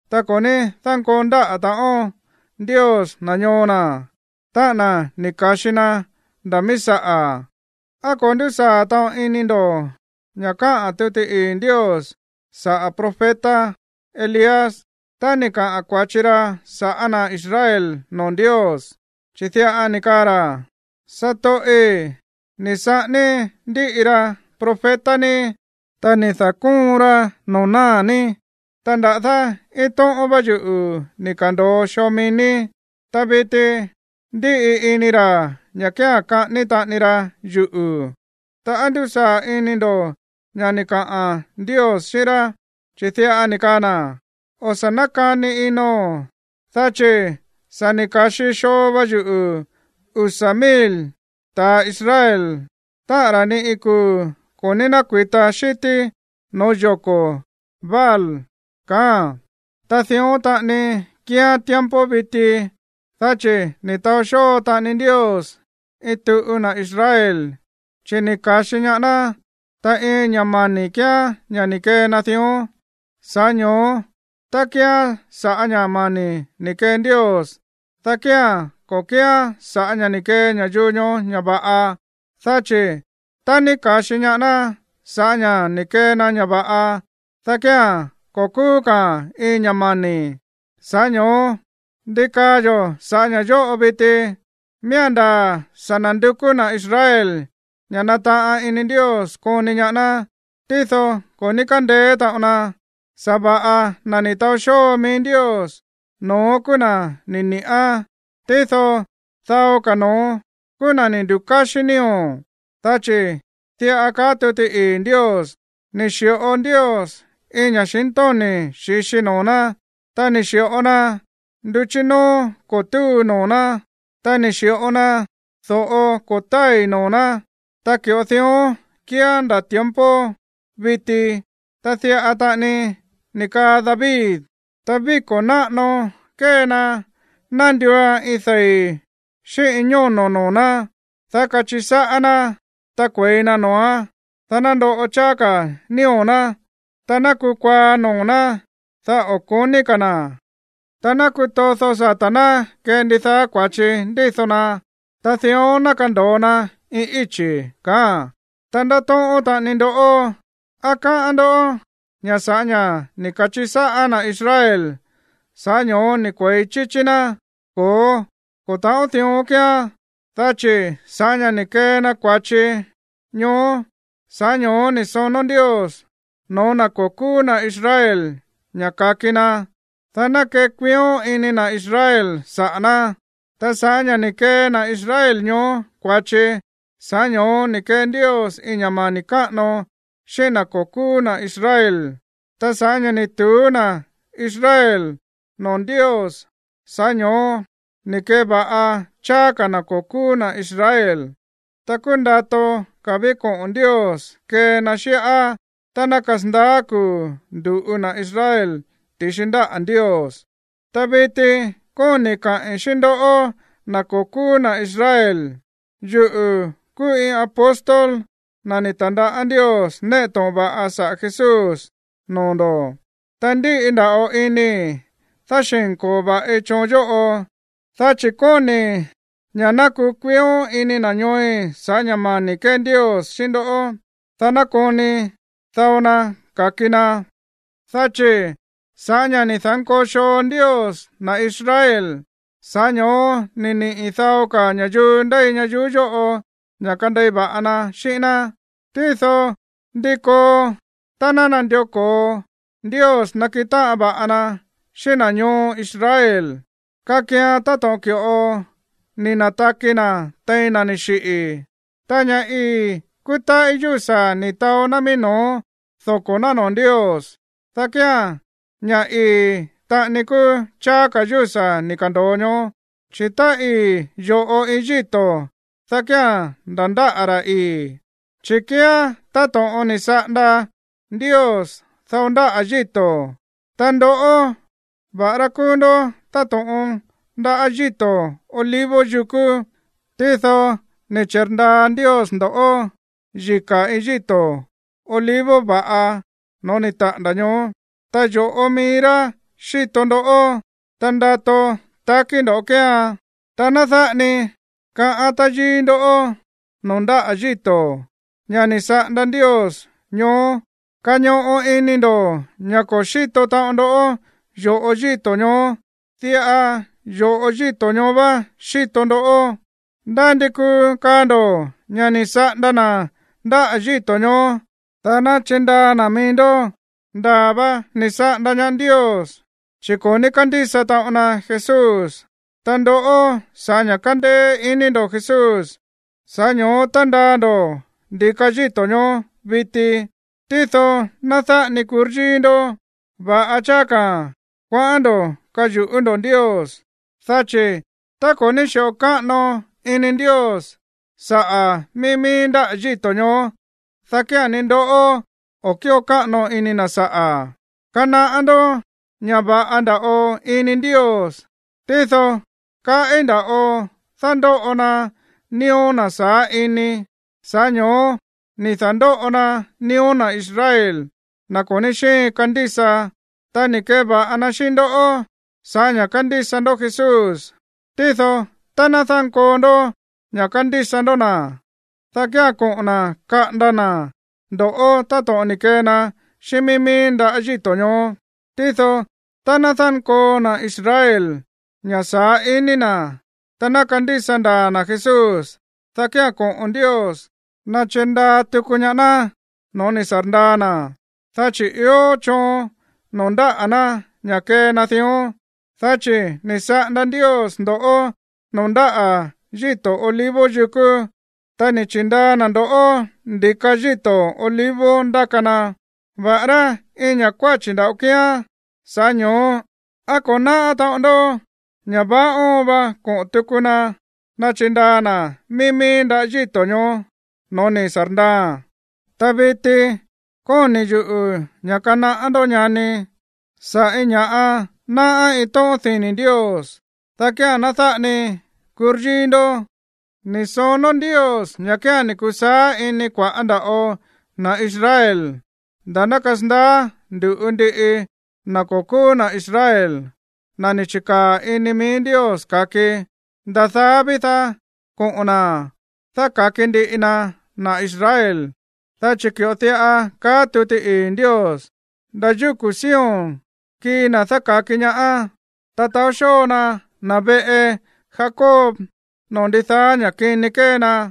Ta ko̱ ní dánkoo ndáꞌa̱ taꞌon Ndios na̱ ñoo na̱, táꞌa̱n na̱ ni̱ ka̱xi na nda̱ mií saꞌa̱. ¿Á ko̱ ndúsaa̱ taꞌon ini ndo̱ ña̱ káꞌa̱n tuti ii̱ Ndios saꞌa̱ profeta Elías tá ni̱ kaꞌa̱n kua̱chi na sa̱ꞌá na̱ Israel noo̱ Ndios? Chi̱ diꞌa ni̱ kaa na̱: “Satoꞌi̱, ni̱ saꞌání ndíꞌi ra profeta ní, ta ni̱ da̱kóon ra noo̱ náa̱ ní, ta nda̱dá iin tóꞌón vá yuꞌu̱ ni̱ ka̱ndo̱o xoo mií ní. Ta viti ndíꞌi ini ra̱ ña̱ kía̱n kaꞌání taꞌani ra yuꞌu̱.” Ta, ¿á ndúsaa̱ ini ndo̱ ña̱ ni̱ kaa Ndios xíꞌín Elías? Chi̱ diꞌa ni̱ kaa na̱: “O̱ sa̱ nákani ino̱n, dá chi̱ sa̱ ni̱ ka̱xi xoo va yuꞌu̱ usa̱ mil ta̱ Israel, táꞌa̱n ra̱ ni iin kuu̱ ko̱ ní nákui̱ta xi̱tí noo̱ yoko̱ Baal”, kaáa̱n. Ta dión taꞌani kíán tiempo viti, dá chi̱ ni̱ taó xóo taꞌani Ndios iin tuꞌu na̱ Israel, chi̱ ni̱ ka̱xi ñaá ná, ta iin ña̱ mani̱ kíán ña̱ ni̱ kee na dión. Sa̱ꞌá ño̱ó, tá kíán sa̱ꞌá ña̱ mani̱ ni̱ kee Ndios, dá kía̱n ko̱ kíán sa̱ꞌá ña̱ ni̱ kee ña̱yuu ñoó ña̱ va̱ꞌa. Dá chi̱ tá ní ka̱xi ñaá ná sa̱ꞌá ña̱ ni̱ kee na ña̱ va̱ꞌa, dá kía̱n ko̱ kúú ka̱a̱n iin ña̱ mani̱. Sa̱ꞌá ño̱ó, ¿ndi kaa yo̱ sa̱ꞌá ña̱ yóꞌo viti? Miía̱n ndaa̱ sa̱ na̱ndukú na̱ Israel ña̱ nataꞌan ini Ndios koni ñaá ná, tído ko̱ ní kándeé taꞌon na. Sa̱va̱ꞌa na̱ ni̱ taó xóo mií Ndios, no̱ón kúú na̱ ni̱ ni̱ꞌán. Tído dao ka̱ no̱ón kúú na̱ ni̱ ndukáxí nío̱. Dá chi̱ diꞌa kaá tuti ii̱ Ndios: “Ni̱ xi̱ꞌo Ndios iin ña̱xintóni̱ xi̱xi noo̱ ná, ta ni̱ xi̱ꞌo na nduchí nóó ko̱ túu noo̱ ná, ta ni̱ xi̱ꞌo na do̱ꞌo ko̱ tái̱ noo̱ ná. Ta ki̱ꞌo dión kíán nda̱ tiempo viti.” Ta diꞌa taꞌani ni̱ kaa David: Ta víko̱ náꞌano kée na ná nduuan iin dei̱ xíꞌín iin ñóno̱ noo̱ ná, dá kachiꞌi sáꞌá ná, ta kue̱i na noo̱án, dá ná ndoꞌo cháá ka̱ nío̱ ná. Ta ná kukuaá noo̱ ná, dá o̱ ko̱ní ka̱ na̱, ta ná kutódo sata̱ ná kee ndidaá kua̱chi ndído na. Ta dión ná kando̱o na iin íchi̱, kaáa̱n. Ta ndáto̱ꞌón taꞌanii ndo̱ꞌó: ¿Á káꞌán ndó ña̱ sa̱ꞌá ña̱ ni̱ ka̱chiꞌi sáꞌá na̱ Israel, sa̱ꞌá ño̱ó ni̱ kue̱i chíchí ná? Ko̱ó, ko̱ ta̱ꞌón dión kíán. Dá chi̱ sa̱ꞌá ña̱ ni̱ kee na kua̱chi ñoó, sa̱ꞌá ño̱ó ni̱ sonó Ndios no̱ó na̱ ko̱ kúú na̱ Israel ña̱ ka̱ki na, dá ná kekuión ini na̱ Israel saꞌa̱ ná. Ta sa̱ꞌá ña̱ ni̱ kee na̱ Israel ñoó kua̱chi, sa̱ꞌá ño̱ó ni̱ kee Ndios iin ña̱ mani̱ káꞌano xíꞌín na̱ ko̱ kúú na̱ Israel. Ta sa̱ꞌá ña̱ ni̱ tu̱ú na̱ Israel noo̱ Ndios, sa̱ꞌá ño̱ó ni̱ keva̱ꞌa cháá ka̱ na̱ ko̱ kúú na̱ Israel. Ta kúú ndato ka̱ ví koꞌo̱n Ndios kee na xíꞌá tá ná kasandaá kuu̱ ndu̱ꞌu na̱ Israel ti̱xi ndáꞌa̱ Ndios. Ta viti kóni̱i̱ kaꞌi̱n xíꞌín ndoꞌó, na̱ ko̱ kúú na̱ Israel. Yuꞌu̱ kúú iin apóstol, na̱ ni̱ ta̱ndaꞌá Ndios néꞌe to̱ꞌon va̱ꞌa saꞌa̱ Jesús noo̱ ndo̱, ta ndíꞌi nda̱ꞌo inii̱ dáxi̱nko̱o va̱ꞌi choon yóꞌo, dá chi̱ kóni̱i̱ ña̱ ná kukuión ini na̱ ñooi̱ sa̱ꞌá ña̱ mani̱ ni̱ kee Ndios xíꞌín ndó, dá ná koni dao na ka̱ki na. Dá chi̱ sa̱ꞌá ña̱ ni̱ da̱nkoo xoo Ndios na̱ Israel, sa̱ꞌá ño̱ó ni̱ niꞌi̱ dao ka̱ ña̱yuu ndéi ñayuú yóꞌo ña̱ kandei va̱ꞌa na xíꞌín ná. Tído, ¿ndi koo tá ná nandió ko̱o Ndios nakiꞌin táꞌan va̱ꞌa na xíꞌín na̱ ñoo Israel? Kakian táto̱ꞌon ki̱ꞌo ni̱ na̱taki na̱ tein na̱ ni̱ xiꞌi̱. Tá ña̱ ii̱ kúú táꞌí yúsa̱ ni̱ taó ná mií no̱ó doko̱ ná noo̱ Ndios, dá kía̱n ña̱ ii̱ taꞌani kúú cháá ka̱ yúsa̱ ni̱ ka̱ndo̱o ñoó. Chi̱ tá ii̱ yo̱ꞌo iin yíto̱, dá kía̱n nda̱ ndáꞌa̱ ra̱ ii̱. Chi̱ kíán táto̱ꞌon ni̱ saꞌanda Ndios dao ndáꞌa̱ yíto̱, ta ndoꞌó, va̱ꞌará kúú ndó táto̱ꞌon ndaꞌá yíto̱ olivo yukú, tído ni̱ chi̱rndaa Ndios ndo̱ꞌó yika̱ iin yíto̱ olivo va̱ꞌa no̱ó ni̱ taꞌa̱nda̱ ñoó. Ta yo̱ꞌo mií rá xíto ndoꞌó, ta ndato takí ndo̱ kéean. Ta ná dáꞌa ni kaꞌa̱n táyíí ndó noo̱ ndáꞌa̱ yíto̱, ña̱ ni̱ saꞌanda Ndios ñoó. Kañoꞌo ini ndo̱ ña̱ ko̱ xíto taꞌon ndó yo̱ꞌo yíto̱ ñoó. Diꞌa yo̱ꞌo yíto̱ ñoó vá xíto ndoꞌó. Ndá ndi kuu kaa ndo̱ ña̱ ni̱ saꞌanda na̱ ndáꞌa̱ yíto̱ ñoó, dá ná chirndaa na̱ mií ndó. Ndaa̱ va ni̱ saꞌanda ñaá Ndios, chi̱ ko̱ ní kándísa taꞌon na Jesús. Ta ndoꞌó, sa̱ꞌá ña̱ kándéé iní ndo̱ Jesús, sa̱ꞌá ño̱ó tándaa ndo̱ ndi̱ka yíto̱ ñoó viti. Tído ná dáꞌa ni kuryíí ndó. Va̱ꞌa cháá ka̱ kuaꞌán ndo̱ yu̱ꞌú ndo̱ Ndios. Dá chi̱ tá ko̱ ní xi̱ꞌo káꞌano ini Ndios saꞌa̱ mií mií ndáꞌa̱ yíto̱ ñoó, dá kía̱n ni ndoꞌó o̱ kíꞌo káꞌano ini na̱ saꞌa̱. Kanaꞌá ndó ña̱ va̱ꞌa nda̱ꞌo ini Ndios, tído kaꞌí nda̱ꞌo dándóꞌo na nío̱ na̱ saá ini. Sa̱ꞌá ño̱ó ni̱ da̱ndóꞌo na nío̱ na̱ Israel, na̱ ko̱ ní xíin kandísa, ta ni̱ keva̱ꞌa na xíꞌín ndó sa̱ꞌá ña̱ kándísa ndó Jesús. Tído tá ná dánkoo ndó ña̱ kandísa ndó na̱, dá kía̱n koꞌo̱n na̱ kaꞌanda na̱ ndo̱ꞌó táto̱ꞌon ni̱ kee na xíꞌín mií mií ndaꞌá yíto̱ ñoó. Tído tá ná dánkoo na̱ Israel ña̱ saá ini na̱, ta ná kandísa ndaa̱ na̱ Jesús, dá kía̱n koꞌo̱n Ndios nachirndaa tuku ñaá ná no̱ó ni̱ sa̱rndaa na̱, dá chi̱ ió choon noo̱ ndáꞌa̱ ná ña̱ kee na dión. Dá chi̱ ni̱ saꞌanda Ndios ndo̱ꞌó noo̱ ndáꞌa̱ yíto̱ olivo yukú, ta ni̱ chi̱ndaa na̱ ndo̱ꞌó ndi̱ka yíto̱ olivo ndáka na, va̱ꞌará iin ña̱ kuáchi̱ nda̱ꞌo kíán. Sa̱ꞌá ño̱ó, ¿á ko̱ náꞌá taꞌon ndó ña̱ vaá óon va koꞌo̱n tuku na nachindaa na̱ mií mií ndáꞌa̱ yíto̱ ñoó no̱ó ni̱ sa̱rndaaa̱n? Ta viti kóni̱ yuꞌu̱ ña̱ kanaꞌá ndoꞌó, ñani, sa̱ꞌá iin ña̱ꞌa náꞌá iin tóꞌón dini̱ Ndios, dá kía̱n ná dáꞌa ni kuryíí ndó. Ni̱ sonó Ndios ña̱ kía̱n ni̱ kusaá ini kua̱ꞌá nda̱ꞌo na̱ Israel nda̱ ná kasandaá ndu̱ꞌu ndiꞌi na̱ ko̱ kúú na̱ Israel, na̱ ni̱ chi̱kaa̱ ini mií Ndios ka̱ki. Nda̱ daá ví, dá koꞌo̱n na̱ dáka̱ki ndiꞌi na na̱ Israel. Dá chi̱ ki̱ꞌo diꞌa kaá tuti ii̱ Ndios: Nda̱ yúku̱ Sion kii na̱ dáka̱ki ñaá, ta taó xóo na na̱ veꞌe Jacob noo̱ ndidaá ña̱ kini kée na.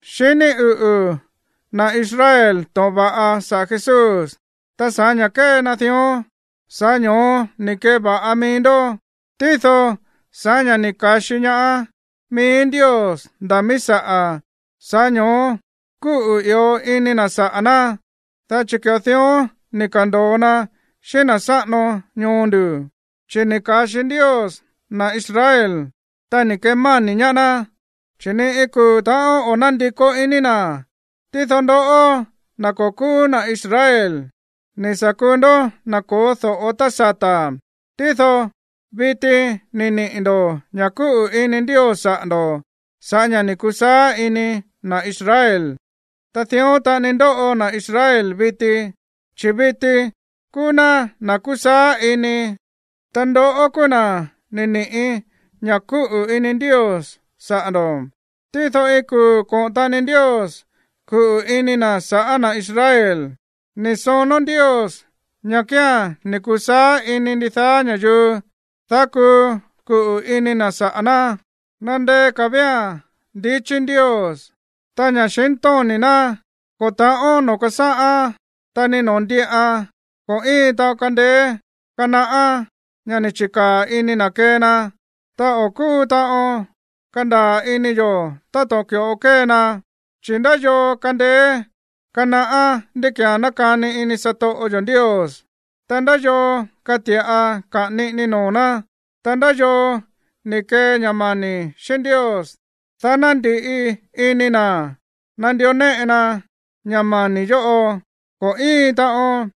Xiní uꞌu̱ na̱ Israel to̱ꞌon va̱ꞌa saꞌa̱ Jesús, ta sa̱ꞌá ña̱ kée na dión, sa̱ꞌá ño̱ó ni̱ keva̱ꞌa mií ndó. Tído sa̱ꞌá ña̱ ni̱ ka̱xi ñaá mií Ndios nda̱ míí saꞌa̱, sa̱ꞌá ño̱ó kúꞌu̱ i̱ó ini na̱ saꞌa̱ ná, dá chi̱ ki̱ꞌo dión ni̱ ka̱ndo̱o na xíꞌín na̱ sáꞌano ñoo ndu̱. Chi̱ ni̱ ka̱xi Ndios na̱ Israel, ta ni̱ kemáni̱ ñaá ná, ta ni iin kuu̱ ta̱ꞌón o̱ nándikó iní na̱. Tído ndoꞌó, na̱ ko̱ kúú na̱ Israel, ni̱ sa̱ kuu ndó na̱ ko̱ó do̱ꞌo tá sata̱. Tído viti ni̱ niꞌi̱ ndo̱ ña̱ kúꞌu̱ ini Ndios saꞌa̱ ndo̱ sa̱ꞌá ña̱ ni̱ kusaá ini na̱ Israel. Ta dión taꞌani ndóꞌo na̱ Israel viti. Chi̱ viti kúú ná na̱ kusaá ini, ta ndoꞌó kúú na̱ ni̱ ni̱ꞌí ña̱ kúꞌu̱ ini Ndios saꞌa̱ ndo̱. Tído iin kuu̱ koꞌo̱n taꞌani Ndios kuꞌu̱ ini na̱ sa̱ꞌá na̱ Israel. Ni̱ sonó Ndios ña̱ kía̱n ni̱ kusaá ini ndidaá ña̱yuu, dá kuu kuꞌu̱ ini na̱ saꞌa̱ ná. ¡Nandeé ka̱ vía̱n ndichí Ndios! ¡Ta ña̱xintóni̱ ná, ko̱ ta̱ꞌón noo̱ kásáꞌán, ta ni noo̱ ndíꞌan! Ko̱ íin taꞌon kándéé kanaꞌá ña̱ ni̱ chi̱kaa̱ ini na̱ kee na, ta o̱ kúu taꞌon kandaa̱ ini yo̱ táto̱ꞌon ki̱ꞌo kée na. Chi̱, ¿ndá yoo kandeé kanaꞌá ndí ki̱án nákani ini satoꞌo yo̱ Ndios? Ta, ¿ndá yoo kati̱ꞌa kaꞌa̱n niꞌini noo̱ ná? Ta, ¿ndá yoo ni̱ kee ña̱ mani̱ xíꞌín Ndios, dá ná ndi̱ꞌi ini na̱ nandió néꞌe na ña̱ mani̱ yóꞌo? Ko̱ íin taꞌon.